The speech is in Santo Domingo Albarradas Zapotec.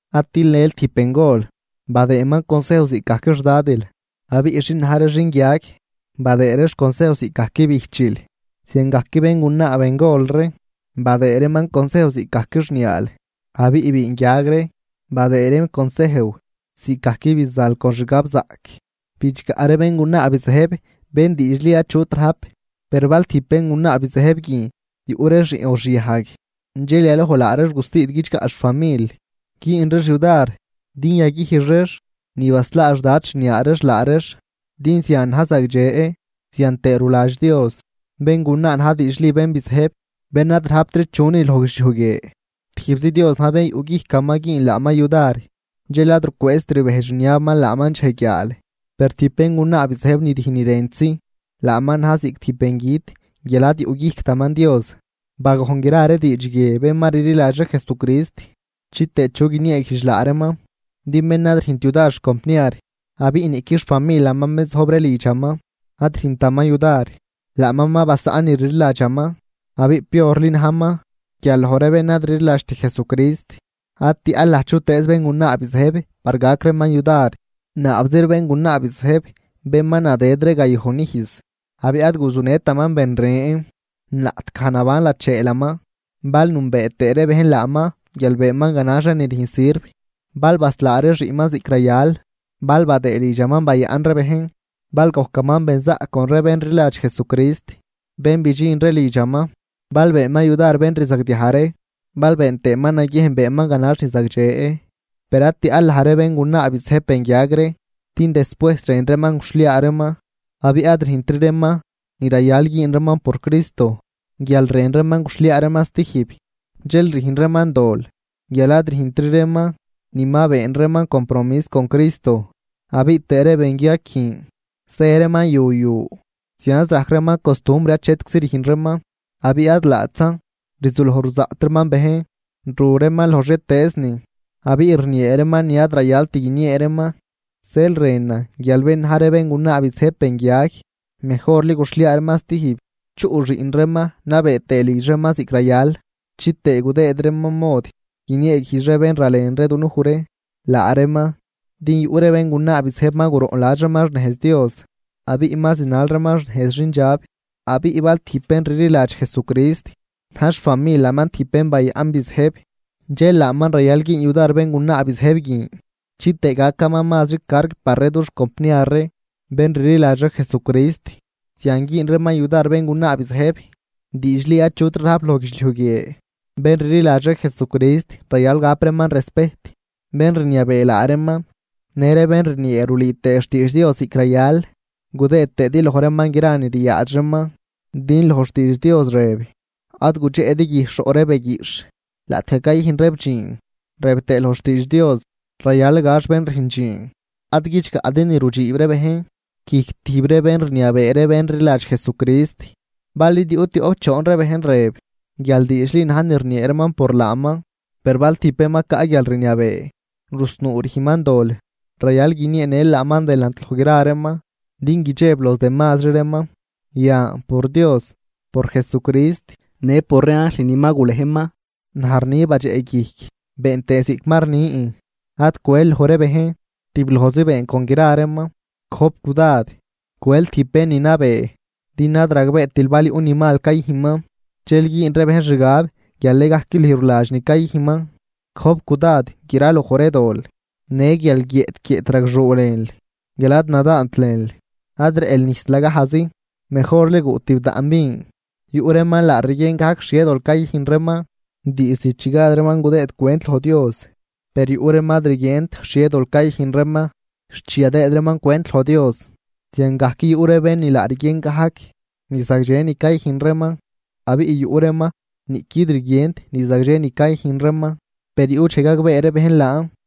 Ad tilnël tijb bengol, badëëman consejw ziꞌcgajc xdadil, abiꞌ xin na̱j ree xinguiag, badëë reex consejw ziꞌcgajc bijchil. Ziangajc béngunaa bengol ree badëë reeman consejw ziꞌcgajc xniaal, abiꞌ biinguiag ree, badëë reem consejw ziꞌcgajc bizanl con xgabzaꞌc. Bidxgaꞌ ree béngunaa bizëjb ni diidxli achut rajp. Per bal tijb béngunaa bizëjb guin yuꞌ ree xiꞌn o xiajg, dxel yaloj laa reex gusiid guidxgaꞌ xfamil, güün reex yudar din yaguijx reex ni baslaa xdad xniaa reex laa reex. Din zian na̱j zagdxe, zian tëë ruladx Dios. Béngunaa na̱j diidxli bén bizëjb, bén ad rajptri chunin loj guidxliuj guie, tijbzi Dios na̱j bén yuꞌguijcaman güün laaman yudar dxel ad rucwëëzt rbejdx rniabaman laaman dxej guiaal. Per tijb béngunaa bizëjb ni rüjn ni rëntzi, laaman na̱j ziꞌc tijb bengüt guial ad yuꞌguijctaman Dios. Bagojn gra ree diidx guie bén ma rliladx ree Jesucrist chitëë chu guinieeguijdx laa reeman. Din bén ad rüjnt yudar xcompniar, abiꞌ niꞌqui xfamilaman bén zojb ree lidxaman ad rüjntaman yudar, laaman ma basaꞌn ni rliladxaman abiꞌ piorli najman guial loj ree bén ad rliladxt Jesucrist. Ad tiaꞌl laj chutëëz béngunaa bizëjb par gac reeman yudar, naabzi ree béngunaa bizëjb bén ma nadëd ree gayojn ijz abiꞌ ad guzunëtaman ben ren laꞌtgaj naban lacheelaman. Bal nünbee tëë ree bejn laaman guial beenman ganax ree ni rüjn sirv, bal baslaa ree xiꞌnman ziꞌc rayal, bal badëë lidxaman bayaꞌn ree bejn bal gojcaman benzaꞌc con ree bén rliladx Jesucrist bén bidxin ree lidxaman, bal beenman yudar bén rzagdiaj ree, bal been tëëman naguiejn beenman ganax ni zagdxe. Per ad tiaꞌl laj ree béngunaa bizëjb benguiag ree, din despuejs rën reeman guxhliaa reeman abiꞌ ad rüjntri reeman ni rayal güün reeman por Cristo guial rën reeman guxhliaa reeman stijb. Dxel rüjn reeman dol guial ad rüjntri reeman ni ma been reeman compromis con Cristo. Abiꞌ tëë ree benguiag guin zë reeman yu yu, zianz rajc reeman costumbr achetczi rüjn reeman. Abiꞌ ad laatzan, rzuloj ruzaꞌt reeman bejn, ru reeman loj xhietëëznin abiꞌ rniee reeman ni ad rayalt guiniee reeman. Zeel rënan guial bén na̱j ree béngunaa bizëjb benguiag, mejorli guxhliaa reeman stijb, chuꞌ xiꞌn reeman nabee tëë lidx reeman ziꞌc rayal, chitëë gudëëd reeman mod guinieeguijdx ree bén ralen ree dunuj ree laa reeman. Din yuꞌ ree béngunaa bizëjb ma guroꞌnladx reeman xnejz Dios abiꞌ ma zinal reeman xnejz xindxab. Abiꞌ bal tijb bén rliladx Jesucrist na̱j xfamilaman tijb bén bayaꞌn bizëjb, dxel laaman rayal güün yudar béngunaa bizëjb guin chitëë gacan mazri carg par ree dux compniar ree bén rliladx ree Jesucrist. Zian güün reeman yudar béngunaa bizëjb diidxli achutri rajp loj guidxliuj guie. Bén rliladx ree Jesucrist rayal gap reeman respejt bén rniabee laa reeman në ree bén rniee rulüü tëë xtiidx Dios ziꞌc rayal, gudëë tëëdi loj reeman gra ni ryaadx reeman. Din loj xtiidx Dios rëb: “Ad gudxeꞌdi guijxh roꞌ ree beguiꞌxh laꞌtgaj cayüjn reeb dxiin”, rëb tëë loj xtiidx Dios: “Rayal gax bén rüjn dxiin”. Ad guidxgaꞌdi ni rudxiib ree bejn guijc tijb ree bén rniabee ree bén rliladx Jesucrist, bal id yuꞌ tioꞌp choon ree bejn rëb guial diidxli na̱j ni rniee reeman por laaman. Per bal tijb bén ma caꞌ guialrniabee rusnuu rüjnman dol, rayal guinieenël laaman delant loj gra reeman din guidxeb los demazri reeman. Yan por Dios, por Jesucrist në por ree anjl ni ma gulejman, naj rni badxeꞌguijc been tëë ziꞌc ma rnin ad cwel loj ree bejn, tiblojzi been con gra reeman. Gojp cudad cwel tijb bén ni nabee din ad ragbeetil bal yuꞌ ni mal cayüjnman, dxel güün ree bejn xgab guial nëgajc lüj ruladx ni cayüjnman. Gojp cudad graloj ree dol. Në guial guiëꞌt guiëꞌt ragxuu lënl guial ad nadaant lënl, ad rëꞌl nijs lagajzi mejorli guꞌ tibdaꞌn vin. Yuꞌ reeman laa rguien gajc xhie dol cayüjn reeman diizd chi gad reeman gudëëd cwent loj Dios, per yuꞌ reeman ad rguient xhie dol cayüjn reeman xt chi yadëëd reeman cwent loj Dios. Ziangajc yuꞌ ree bén ni laa rguien gajc ni zagdxe ni cayüjn reeman, abiꞌ yuꞌ reeman niꞌquid rguient ni zagdxe ni cayüjn reeman, per yuꞌ dxej gagbee ree bejn laan.